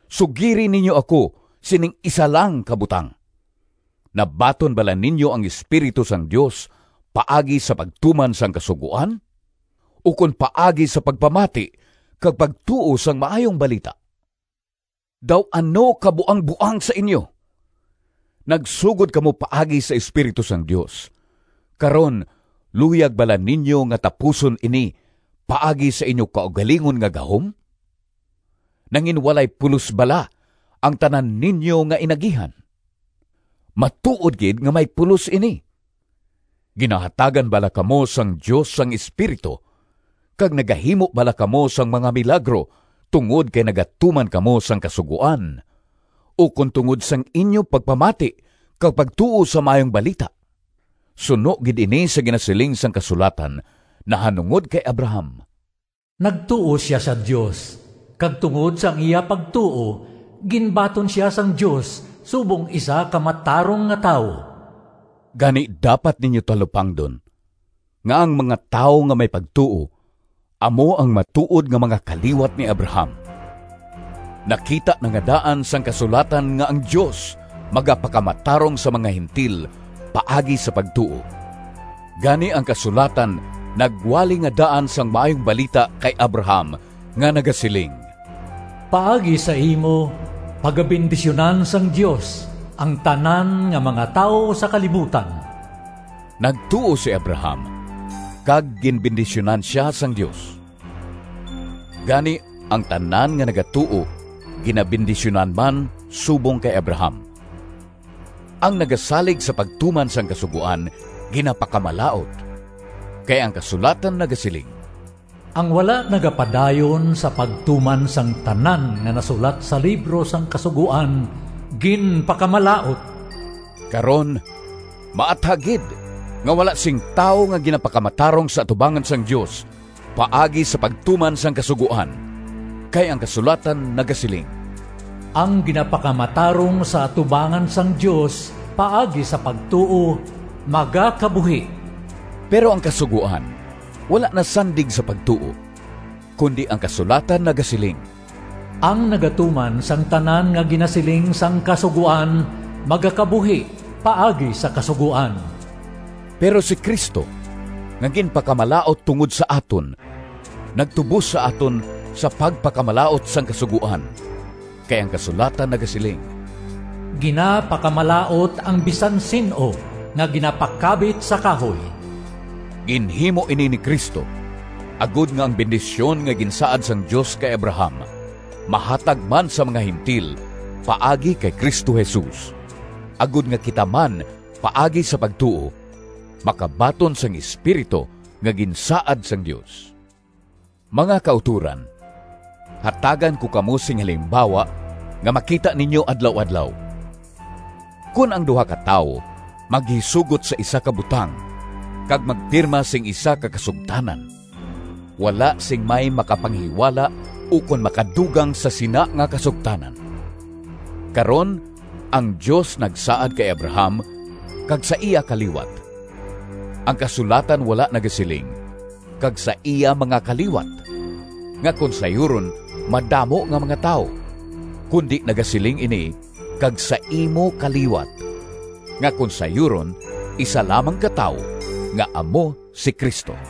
Sugiri ninyo ako sining isa lang ka butang: nabaton bala ninyo ang Espiritu sang Dios paagi sa pagtuman sang Kasugoan, ukon paagi sa pagpamati kag pagtuo sang Maayong Balita? Daw ano ka buangboang sa inyo! Nagsugod kamo paagi sa Espiritu sang Dios, karon luyag bala ninyo nga tapuson ini paagi sa inyo kaugalingon nga gahom? Nanginwalay pulos bala ang tanan ninyo nga inagihan? Matuod gid nga may pulos ini! Ginahatagan bala kamo sang Dios sang Espiritu kag nagahimo bala kamo sang mga milagro tungod kay nagatuman kamo sang Kasugoan, ukon tungod sang inyo pagpamati kag pagtuo sa Maayong Balita? Suno gid ini sa ginasiling sang kasulatan nahanungod kay Abraham, “Nagtuo sia sa Dios, kag tungod sang iya pagtuo ginbaton sia sang Dios subong isa ka matarong nga tawo.” Gani dapat ninyo talupangdon nga ang mga tawo nga may pagtuo amo ang matuod nga mga kaliwat ni Abraham. Nakita na nga daan sang kasulatan nga ang Dios magapakamatarong sa mga Gentil paagi sa pagtuo. Gani ang kasulatan nagwali nga daan sang Maayong Balita kay Abraham nga nagasiling, “Paagi sa imo pagabendisyunan sang Dios ang tanan nga mga tawo sa kalibutan.” Nagtuo si Abraham kag ginbendisyunan sia sang Dios. Gani ang tanan nga nagatuo ginabendisyunan man subong kay Abraham. Ang nagasalig sa pagtuman sang Kasugoan ginapakamalaut. Kay ang kasulatan nagasiling, “Ang wala nagapadayon sa pagtuman sang tanan nga nasulat sa libro sang Kasugoan ginpakamalaut!” Karon, maathag gid nga wala sing tawo nga ginapakamatarong sa atubangan sang Dios paagi sa pagtuman sang Kasugoan, kay ang kasulatan nagasiling, “Ang ginapakamatarong sa atubangan sang Dios paagi sa pagtuo magakabuhi.” Pero ang Kasugoan wala nasandig sa pagtuo, kundi ang kasulatan nagasiling, “Ang nagatuman sang tanan nga ginasiling sang Kasugoan magakabuhi paagi sa Kasugoan.” Pero si Cristo nga ginpakamalaut tungod sa aton nagtubos sa aton sa pagpakamalaut sang Kasugoan, kay ang kasulatan nagasiling, “Ginapakamalaut ang bisan sin-o nga ginapakabit sa kahoy.” Ginhimo ini ni Cristo agod nga ang bendisyon nga ginsaad sang Dios kay Abraham mahatag man sa mga Gentil paagi kay Cristo Jesus, agod nga kita man paagi sa pagtuo, makabaton sang Espiritu nga ginsaad sang Dios. Mga kautoran, hatagan ko kamo sing halimbawa nga makita ninyo adlaw-adlaw: kon ang duha ka tawo maghisugot sa isa ka butang kag magpirma sing isa ka kasugtanan, wala sing may makapanghiwala ukon makadugang sa sina nga kasugtanan. Karon, ang Dios nagsaad kay Abraham kag sa iya kaliwat. Ang kasulatan wala nagasiling, “kag sa iya mga kaliwat,” nga kon sayuron, madamo nga mga tawo, kundi nagasiling ini, “kag sa imo kaliwat,” nga kon sayuron isa lamang ka tawo nga amo si Cristo.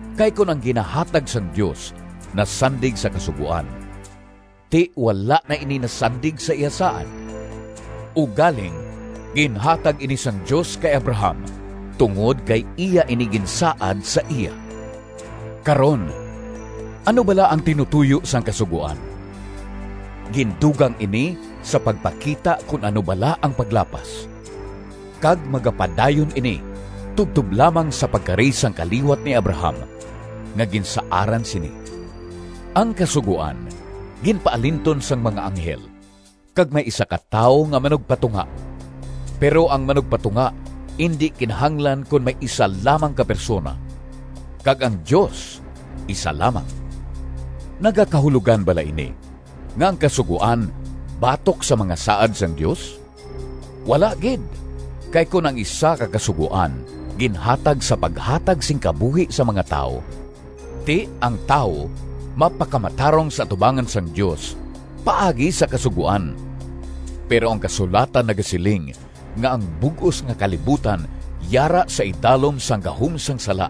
Kay kon ang ginahatag sang Dios nasandig sa Kasugoan, ti wala na ini nasandig sa iya saad. Ugaling, ginhatag ini sang Dios kay Abraham, tungod kay iya ini ginsaad sa iya. Karon, ano bala ang tinutoyo sang Kasugoan? Gindugang ini sa pagpakita kon ano bala ang paglapas, kag magapadayon ini tubtob lamang sa pagkari sang kaliwat ni Abraham, nga ginsaaran sini. Ang Kasugoan ginpaalinton sang mga anghel kag may isa ka tawo nga manugpatunga. Pero ang manugpatunga indi kinahanglan kon may isa lamang ka persona, kag ang Dios isa lamang. Nagakahulogan bala ini nga ang Kasugoan batok sa mga saad sang Dios? Wala gid! Kay kon ang isa ka kasugoan ginhatag sa paghatag sing kabuhi sa mga tawo, ti ang tawo mapakamatarong sa atubangan sang Dios paagi sa kasugoan. Pero ang kasulatan nagasiling nga ang bug-os nga kalibutan yara sa idalom sang gahom sang sala,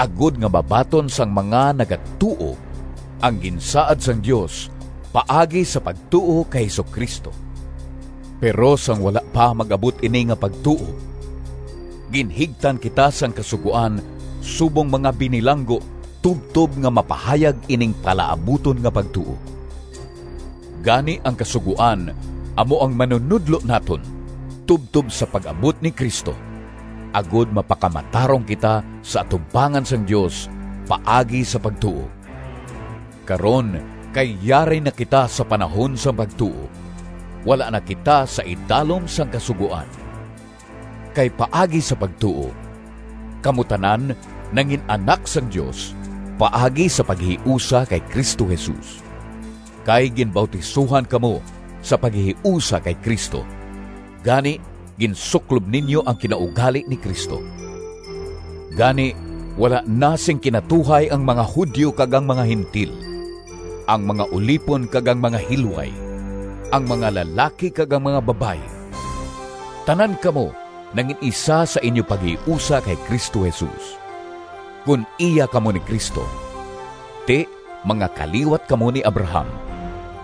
agod nga mabaton sang mga nagatuo ang ginsaad sang Dios paagi sa pagtuo kay Jesu-Cristo. Pero sang wala pa mag-abot ini nga pagtuo, ginhigtan kita sang Kasugoan subong mga binilanggo tubtob nga mapahayag ining palaabuton nga pagtuo. Gani ang Kasugoan amo ang manunodlo naton tubtob sa pag-abot ni Cristo, agod mapakamatarong kita sa atubangan sang Dios paagi sa pagtuo. Karon kay yari na kita sa panahon sang pagtuo, wala na kita sa idalom sang Kasugoan. Kay paagi sa pagtuo kamo tanan nangin-anak sang Dios paagi sa paghiusa kay Cristo Jesus. Kay ginbautisohan kamo sa paghiusa kay Cristo, gani ginsuklob ninyo ang kinaugali ni Cristo. Gani wala na sing kinatuhay ang mga Judio kag ang mga Gentil, ang mga ulipon kag ang mga hilway, ang mga lalaki kag ang mga babayi. Tanan kamo nangin-isa sa inyo paghiusa kay Cristo Jesus. Kon iya kamo ni Cristo, ti mga kaliwat kamo ni Abraham,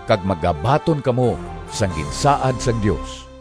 kag magabaton kamo sang ginsaad sang Dios.